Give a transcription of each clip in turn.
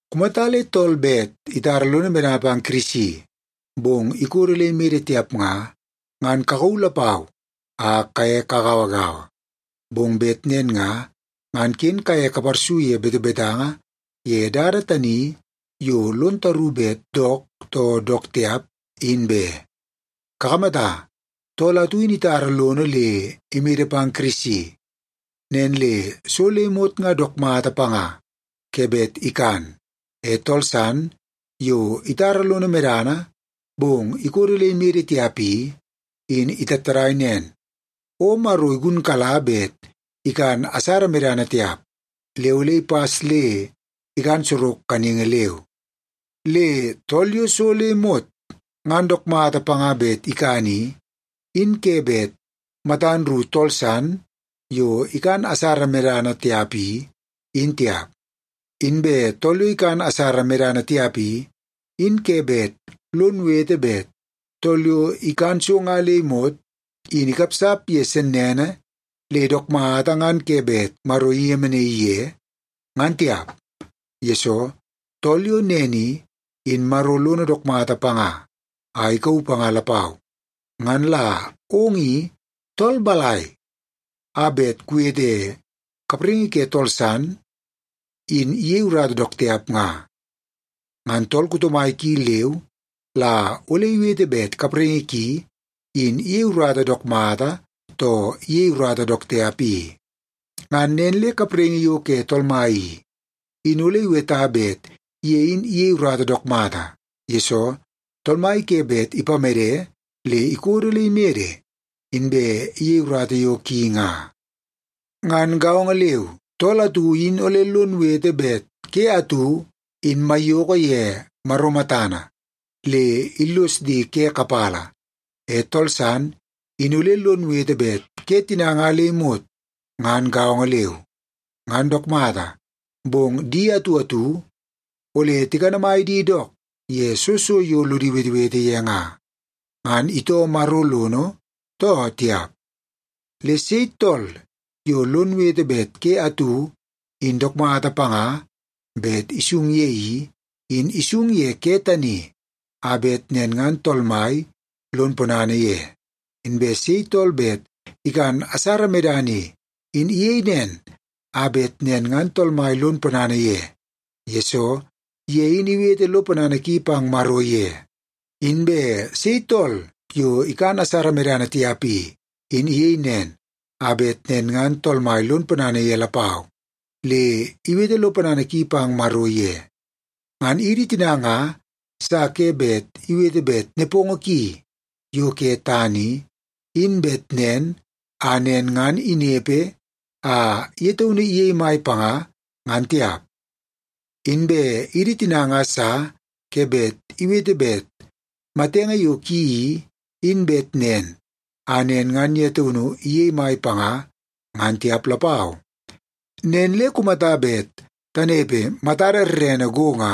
Kumata le tool bet itara lono medana pang Kirisi, bong ikodo le imede tiap nga, ngan kakauu lapau a kaye kagauagaua. Bong bet nen nga, ngan ken kaye kaparsu ye betebetanga ye dada tani yo lon taru bet dook too dook tiap, in be. Kakamata, tool atu in itara lono le imede pang Kirisi, nen le so le imot nga dook mata panga ke bet ikan. E tool san yo itara lono medana, bong ikodo le imede tiap i, in itattadai nen, o Maro igunkala bet ikan asara medana tiap, le ole ipas le ikan sorok kaningi leu. Le tool yo so le imot ngan dook mata panga bet ikan i, in ke bet matan ru tool san yo ikan asara medana tiap i, in tiap. Inbe tool yo ikan asara medana tiap i, in ke bet lon wete bet tool yo ikan so nga le imot in ikapsap ye sennene le dook mata ngan ke bet Maro iyemenaii ye, ngan tiap. Yesoo, tool yo nen i, in Maro lono dook mata panga a ikauu panga lapau. Ngan la ong i tool balai a bet kuwete kapraingi ke tool san in iyei urata dook tiap nga? Ngan tool kuto mai ki leu la ole iwete bet kapraingi ki in iyei urata dook mata, too iyei urata dook tiap i. Ngan nen le kapraingi yo ke Tool Mai i, in ole iweta bet ye in iyei urata dook mata, yesoo Tool Mai ke bet ipamede le ikodo le imede inbe iyei urata yo ki nga. Ngan gaongo leu, tool atu in ole lon wete bet ke atu in maiyoko ye Maro matana le illos di ke kapala. E tool san in ole lon wete bet ke tina nga le imot ngan gaongo leu. Ngan dook mata, bong di atu atu ole tikanamai di dook ye soo so yo lodi wetewete ye nga, ngan itoo Maro lono, too tiap. Le sei tool yo lon wete bet ke atu in dook mata panga bet isung ye i, in isung ye ke tani a bet nen ngan Tool Mai lon ponana ye. Inbe sei tool bet ikan asara medana i, in iyei nen a bet nen ngan Tool Mai lon ponana ye, yesoo ye in iwete lo ponana ki pang Maro ye. Inbe sei tool yo ikan asara medana tiap i, in iyei nen a bet nen ngan Tool Mai lon ponana ye lapau, le iwete lo ponana ki pang Maro ye. Ngan idi tina nga sa ke bet iwete bet nepongo ki yo ke tana i, in bet nen a nen ngan inepe a ye taunu iyei mai panga, ngan tiap. Inbe idi tina nga sa ke bet iwete bet matenge yo ki i, in bet nen a nen ngan ye taunu iyei mai panga, ngan tiap lapau. Nen le kumata bet tanepe matada rerene go nga,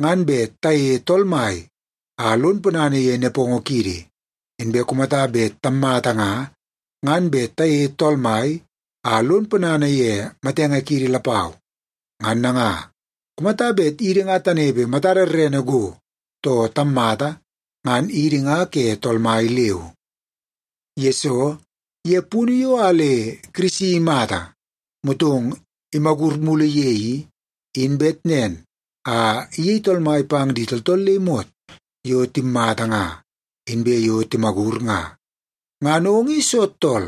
ngan bet tayeie Tool Mai a lon ponana ye nepongo kiidi. Inbe kumata bet tammata nga, ngan bet tayeie Tool Mai a lon ponana ye matenge kiidi lapau. Ngan nanga, kumata bet idi nga tanepe matada rerene go, too tammata, ngan idi nga ke Tool Mai leu. Yesoo, ye punu yo a le Kirisi imata motong imagur mulu ye i, in bet nen a iyei Tool Mai pang di tooltool le imot yo timmata nga, inbe yo timagur nga. Ngan ong in soo tool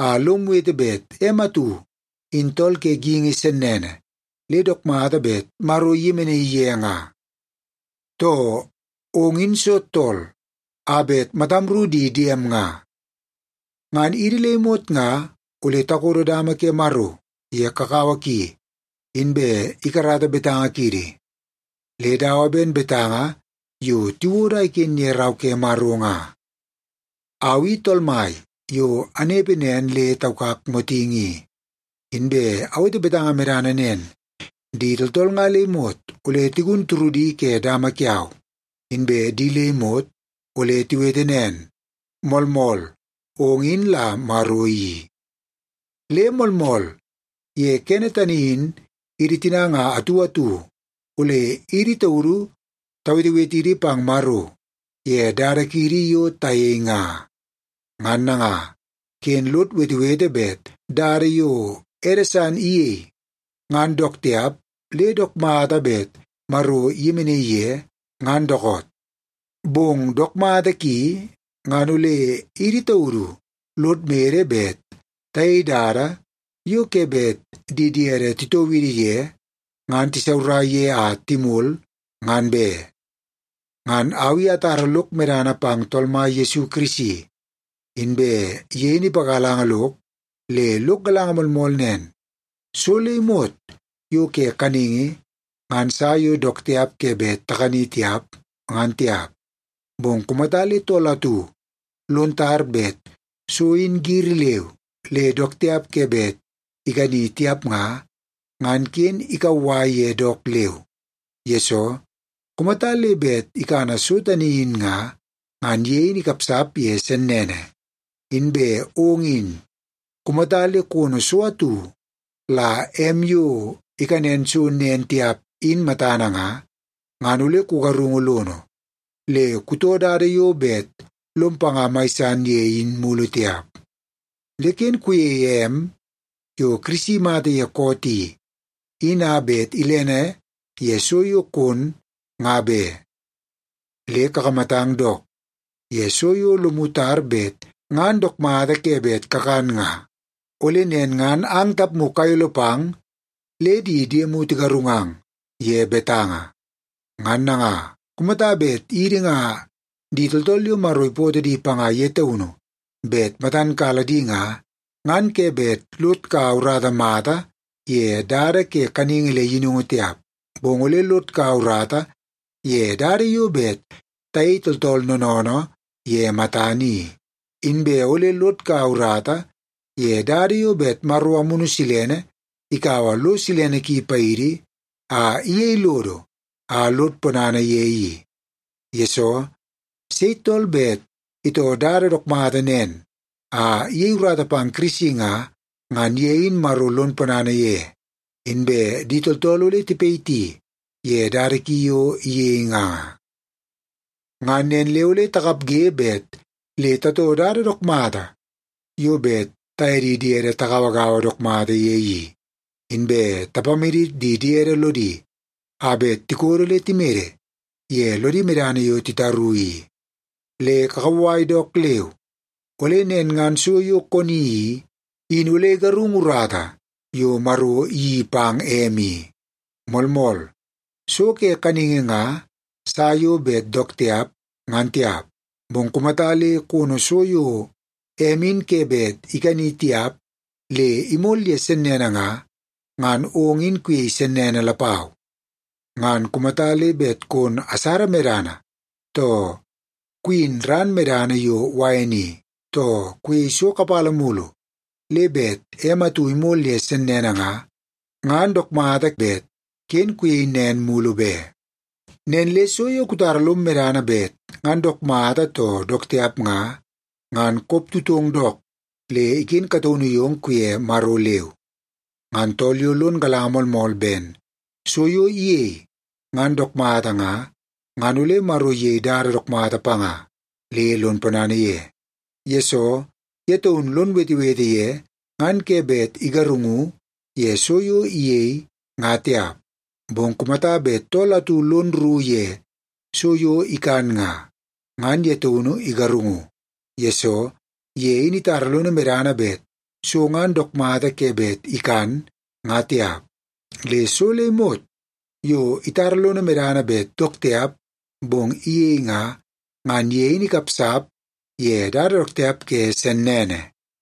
a lom wete bet em atu in tool ke geingi sennene le dook mata bet Maro iyemenaii ye nga? Too, ong in soo tool a bet matam ru di diem nga? Ngan idi le imot nga ole takodo dama ke Maro ye kakawa ki, inbe ikarata betanga kiidi. Le dawa ben betanga yo tiwodo a iken ye Rau ke Maro nga, “Au i Tool Mai yo anepe nen le taukak motingi i. Inbe awete betanga medana nen: Di tooltool nga le imot ole tigun turudi ke dama kiau, inbe di le imot ole tiwete nen, ‘Moolmool, ong in la Maro i.’” Le moolmool, ye kene tani in idi tina nga atu atu ole idi taudu tawetewetidi pang Maro ye dada kiidi yo tayei nga. Ngan nanga, ken lod wetewete bet dada yo ede san iyei, ngan dook tiap le dook mata bet Maro iyemenaii ye, ngan dookoot. Bong dook mata ki ngan ole idi taudu lod mede bet tayei dada yo ke bet di diede titoo idi ye ngan tisaurai ye a timol, ngan be. Ngan au i atara lok medana pang Tool Mai Yesu Kirisi, inbe ye in ipagalanga lok le lok galanga moolmool nen: So le imot yo ke kaningi ngan sa yo dook tiap ke bet takani tiap, ngan tiap. Bong kumata le tool atu lon tar bet so in giri leu le dook tiap ke bet ikani tiap nga, ngan ken ikauwai ye dook leu, yesoo kumata le bet ikana so tani in nga, ngan ye in ikapsap ye sennene. Inbe ong in, kumata le kono so atu la em yo ikanen so nen tiap in matana nga, ngan ole kugarungu lono, le kutoo dada yo bet lom panga mai san ye in mulu tiap. Le ken kuyeie em yo Kirisi imata ye koot i, in a bet ilene ye so yo kon, nga be. Le kakamatang dook ye so yo lomu tar bet ngan dook mata ke bet kakan nga, ole nen ngan ang tapmu kayolo pang le di diemu tigarungang ye betanga. Ngan nanga, kumata bet idi nga di tooltool yo Maro ipootoo di panga ye taunu bet matan kala di nga, ngan ke bet lod kaua urata mata ye dada ke kaningi le yinungu tiap, bong ole lod kaua urata ye dada yo bet tayei tooltool noonoonoo ye matana i. Inbe ole lod kaua urata ye dada yo bet Amunu Silene ikaua lo silene ki paidi a iyei lodo a lod ponana ye i. Yesoo, sei tool bet itoo dada dook mata nen a iyei urata pang Kirisi nga, ngan ye in Maro lon ponana ye, inbe di tooltool ole tipayiti ye dada ki yo iyei nga. Ngan nen le ole takapge bet le tatoo dada dook mata yo bet taye di diede tagauagaua dook mata ye i, inbe tapamadit di diede lodi a bet tikodo le timede ye lodi medana yo titaru i. Le kukauwai dook leu, ole nen ngan so yo koni i, in ole igarungu urata yo Maro iyeii pang em i. Moolmool, so ke kaningi nga sa yo bet dook tiap, ngan tiap, bong kumata le kono so yo em in ke bet ikani tiap le imol ye sennene nga, ngan ong in kuyei sennene lapau. Ngan kumata le bet kon asara medana, too kuyin ran medana yo wain i, too kuyei so kapala mulu le bet em atu imol ye sennene nga, ngan dook mata bet ken kuyei nen mulu be. Nen le so yo kutara lom medana bet ngan dook mata too dook tiap nga, ngan koptutong dook le iken kataunu yong kuye Maro leu. Ngan tool yo lon galanga moolmool ben so yo iyei ngan dook mata nga, ngan ole Maro iyei dada dook mata panga le lon ponana ye, yesoo ye taunu lon wetewete ye ngan ke bet igarungu ye so yo iyei, nga tiap. Bong kumata bet tool atu lon rru ye so yo ikan nga, ngan ye taunu igarungu, yesoo ye in itara lono medana bet so ngan dook mata ke bet ikan, nga tiap. Le so le imot yo itara lono medana bet dook tiap bong iyei nga, ngan ye in ikapsap ye dada dook tiap ke sennene.